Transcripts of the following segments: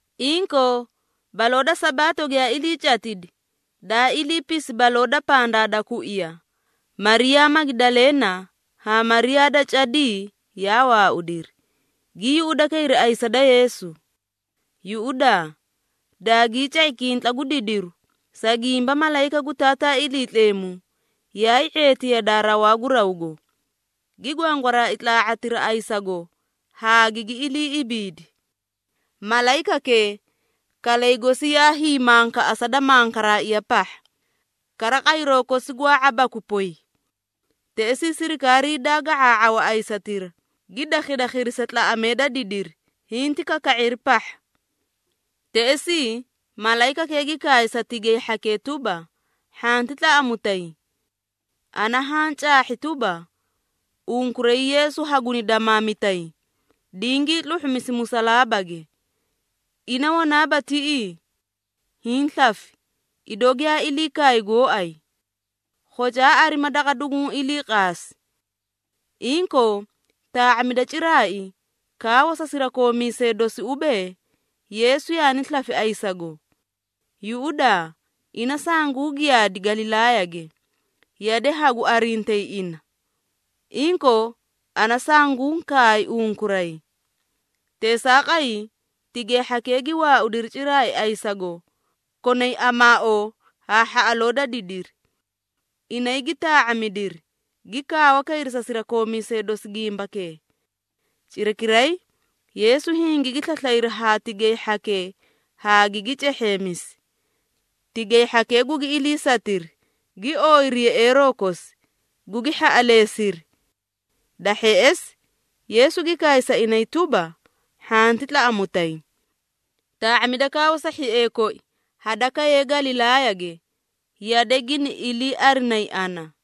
Inkoo, baloo da Sabaato giyaa ilii catidi, daa iliipisi baloo da pandaa da kuiya, Mariyaa Magidaleena haa Mariyaa da cadii yaa waaudiri, gii yuꞌudakayri ayisa da Yeesu. Yuꞌudaa, daagii ca⁄i kintla gu didiru, sa gimba malayika gu Taataa Iliitleemu yaay ⁄eeti yadaa rawaa gu rawgo, gi gwangwaraai tlaa⁄atira ayisago haa gigi ilii ibiidi. Malayikakee, kalay gosi yaa hiimankaꞌasa da mankaraaiya pahha, kara qayroo kosi gwaa ⁄abaakwi poy. Teꞌesii sirikaarii daa ga⁄aa⁄awa ayisatira, gi dakhadakhiri sa tlaꞌamee da didiri, hinti kaka⁄iri pahha. Teꞌesii, malayikakee gi kaay sa tigay hhakee tuba, “Hhanti tlaꞌamutay! Ana haã caahhi tuba, unkuray Yeesu haguni damaamitay, dingii tluhhumisi musalaabage. Ina wanaaba tiꞌii! Hiĩ slafi, idoo giyaa ilii kaay gooay. Khocaa arima daqa duguũ ilii qaasi. Inkoo, taa⁄amida ciraai, kaawa sa sirakoomiisee dosi ubee, ‘Yeesu yaani slafi ayisago. Yuꞌudaa, ina sangu giyaadi Galilaayage, yade hagu arintayi ina. Inkoo, ana sanguũ kaay unkuray.’” Teesaaqay, tigay hhakee gi waaudiri ciraai ayisago, konay amaaoo haa hhaꞌaloo da didiri. Inay gi taa⁄amidiri, gi kaawa kayri sa sirakoomiisee dosi gimbakee. Cirakiray, Yeesu hingigi slaslayri haa tigay hhakee haa gigi cehheemisi. Tigay hhakee gugi iliisatiri, gi ooyiri yeꞌeeroo kosi, gugi hhaꞌaleesiri. Da hheꞌesi, Yeesu gi kaay sa inay tuba, “Hhanti tlaꞌamutay! Taa⁄amida kaawa sa hhiee koi hadakayee Galilaayage, yade gini iliiarinay ana.”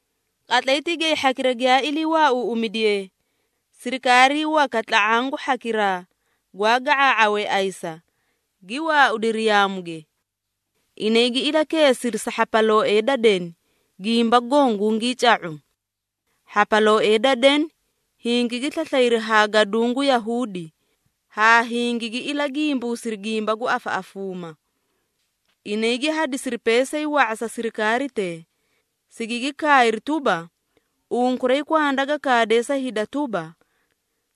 Qatlay tigay hhakira giyaa ilii waauuꞌumidiyee, sirikaarii waka tla⁄aã gu hhakiraa gwaa ga⁄aa⁄awee ayisa, gi waaudiri yaamuge. Inay gi ilakeesiri sa hhapalooee da deni, gimba goõ gungii ca⁄u. Hhapalooee da deni hingigi slaslayri haa gaduũ gu Yahuudi, haa hingigi ilagimbuusiri gimba gu afaꞌafuuma. Inay gi hadisiri peesay wa⁄a sa sirikaaritee, sigigi kaayri tuba, “Unkuray kwanda ga kaadee sa hida tuba,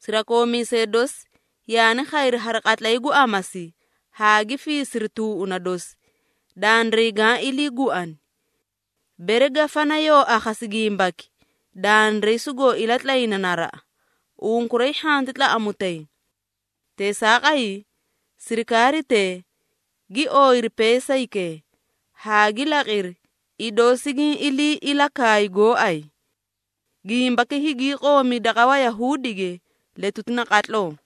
‘Sirakoomiisee dosi yaani khayri hari qatlay gu amasi, haa gi fiisiri tuuꞌuna dosi, dandiray gaã iliiguani.’ Bere gafana yoo akhasi gimbaki, dandiray sugoo ilatlayna naraꞌa, unkuray hhanti tlaꞌamutay.” Teesaaqay, sirikaaritee gi ooyiri peesaykee, haa gi laqiri, idoo sigiĩ ilii ilakaay gooay. Gimbaki hingii qoomi daqa Wayahuudige letuti naqatloo.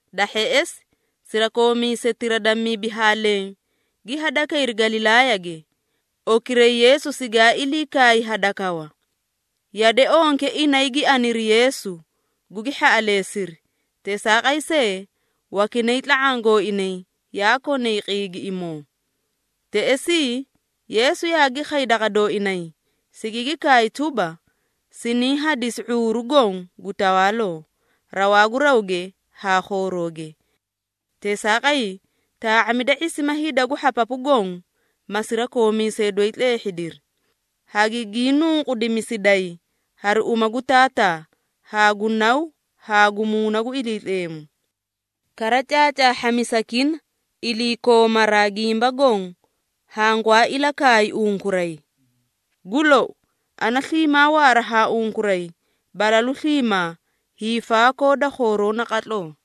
Da hheꞌesi, sirakoomiisetira da mibi haa leẽ gi hadakayri Galilaayage, okiray Yeesu sigaa ilii kaay hadakawa. Yade onke inay gi aniri Yeesu, gugi hhaꞌaleesiri. Teesaaqay see, wakinay tla⁄aã gooinay yaa konay qiigiꞌimoo. Teꞌesii, Yeesu yaagi khay daqa dooinay, sigigi kaay tuba, “Siniĩ hadisi ⁄uuru goõ gu tawaaloo, rawaa gu rawge haa khoorooge. Teesaaqay, taa⁄amida ⁄isima hida gu hhapapu goõ, ma sirakoomiisee doyi tleehhidiri, hagigii nunqudimisiday hari uma gu Taataa, haa gu Naw haa gu Muuna gu Iliitleemu. Kara caacaahhamisakina iliikoomaraa gimba goõ hangwaa ilakaay unkuray. Gu lou, ana sliimaa waara haa unkuray balalu sliimaa, hiifaakoo da khooroo naqatloo.”